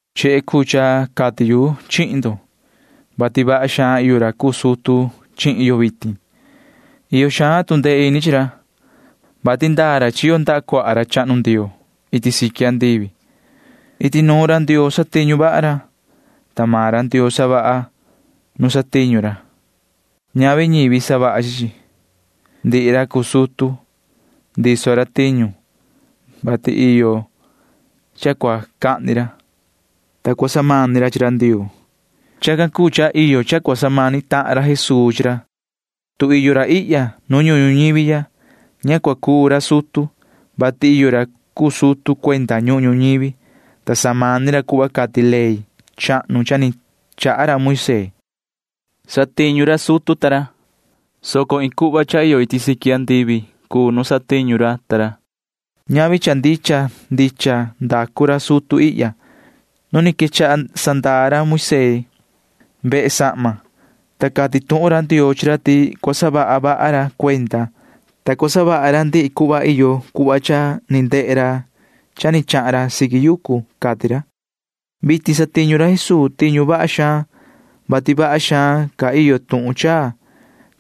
Chehe cuu cha cati yu chihi ndo, vati vaha xaan iyo ra cuu sutu chihin yo vitin. Iyo xaan tu ndee ini chi ra, vati ndaa ra chiyo ndaha cuaha ra chahnu Ndioo iti siqui andivi. Iti nuun ra Ndioo satiñu vaha ra, ta maan ra Ndioo savaha nu satiñu ra. Ñavi ñivi savaha chi chi. Ndihi ra cuu sutu―ndiso ra tiñu, vati iyo cha cua cahni ra, ta cua samani ra chi ra Ndioo. Chacan cuu cha iyo cha cua samani tahan ra Jesuu chi ra. Tu iyo ra ihya nu ñuhun ñuñivi ya, ña cua cuu ra sutu, vati iyo ra cuu sutu cuenda ñuhun ñuñivi, ta samani ra cuhva cati ley chahnu cha ni chaha ra Moisee. Satiñu ra sutu ta ra, soco iin cuhva cha iyo iti siqui andivi cuu nu satiñu ra ta ra. Ñavi cha ndicha ndicha ndacu ra sutu ihya. Nu ni quechaha sandaa ra Moisee vehe sahma, ta cati tuhun ra Ndioo chi ra ti cua saha vaha ra cuenda, ta cua savaha ra ndihi cuhva iyo cuhva cha ni ndehe ra cha ni chahan ra siqui yucu, cati ra. Vitin satiñu ra Jesuu tiñu vaha xaan ca, vati vaha xaan ca iyo tuhun chaa,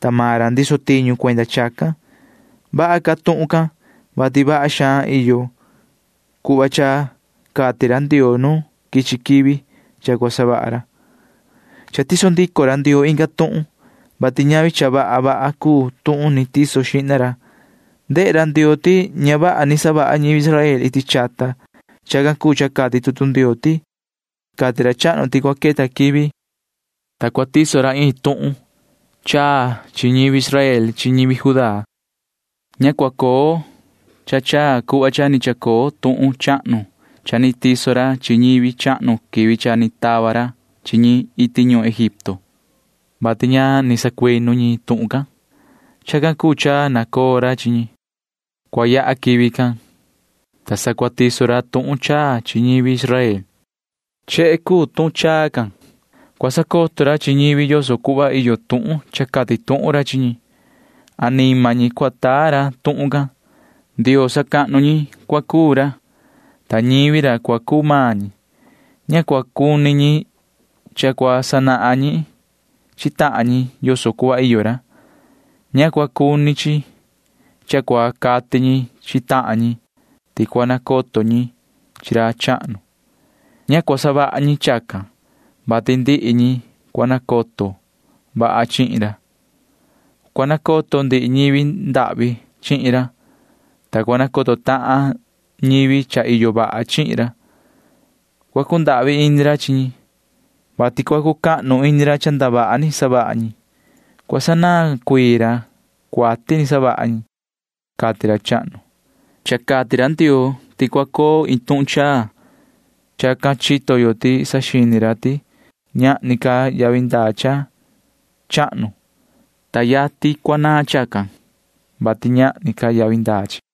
ta maan ra ndiso tiñu cuenda chacan. Vaha ca tuhun can, vati vaha xaan ca iyo cuhva cha cati ra Ndioo nu quichi quivi cha cua savaha ra. Cha tiso ndico ra Ndioo inga tuhun, vati ñavi cha vaha vaha cuu tuhun ni tiso xihna ra. Ndehe ra Ndioo ti ña vaha ni savaha ñivi Israel iti chata. Chacan cuu cha cati tutu Ndioo ti: Cati ra chahnu ti cua queta quivi, ta cua tiso ra iin tuhun chaa chi ñivi Israel chi ñivi Judá. Ña cua coo cha chaa cuhva cha ni chacoo tuhun chahnu cha ni tiso ra chi ñivi chahnu quivi cha ni tava ra chi ñi iti ñuhun Egipto, vati ña ni sacuinu ñi tuhun can. Chacan cuu cha nacoo ra chi ñi. Cua yaha quivi can, ta sa cua tiso ra tuhun chaa chi ñivi Israel. Chehe cuu tuhun chaa can. Cua sacoto ra chi ñi yoso cuhva iyo tuhun cha cati tuhun ra chi ñi. Anima ñi cua taa ra tuhun can. Ndioo sacahnu ñi cua cuu ra, ta ñivi ra cua cuu maan ñi. Ña cua cuni chi cha cua sanahan ñi chi tahan ñi yoso cuhva iyo ra. Ña cua cuni chi cha cua cati ñi chi tahan ñi ti cua nacoto ñi chi ra chahnu. Ña cua savaha ñi chacan, vati ndihi ñi cua nacoto vaha chihin ra. Cua nacoto ndihi ñivi ndahvi chihin ra, ta cua nacoto tahan ñivi cha iyo vaha chihin ra. Cua cundahvi ini ra chi ñi, vati cua cucahnu ini ra cha ndavaha ni savaha ñi. Cua sanaan cuii ra cuati ni savaha ñi, cati ra chahnu. Cha cati ra Ndioo ti cua coo iin tuhun chaa. Chacan chito yo ti saxini ra ti ñahni ca yavi ndaa cha chahnu, ta yatin cua naan chacan, vati ñahni ca yavi ndaa chi.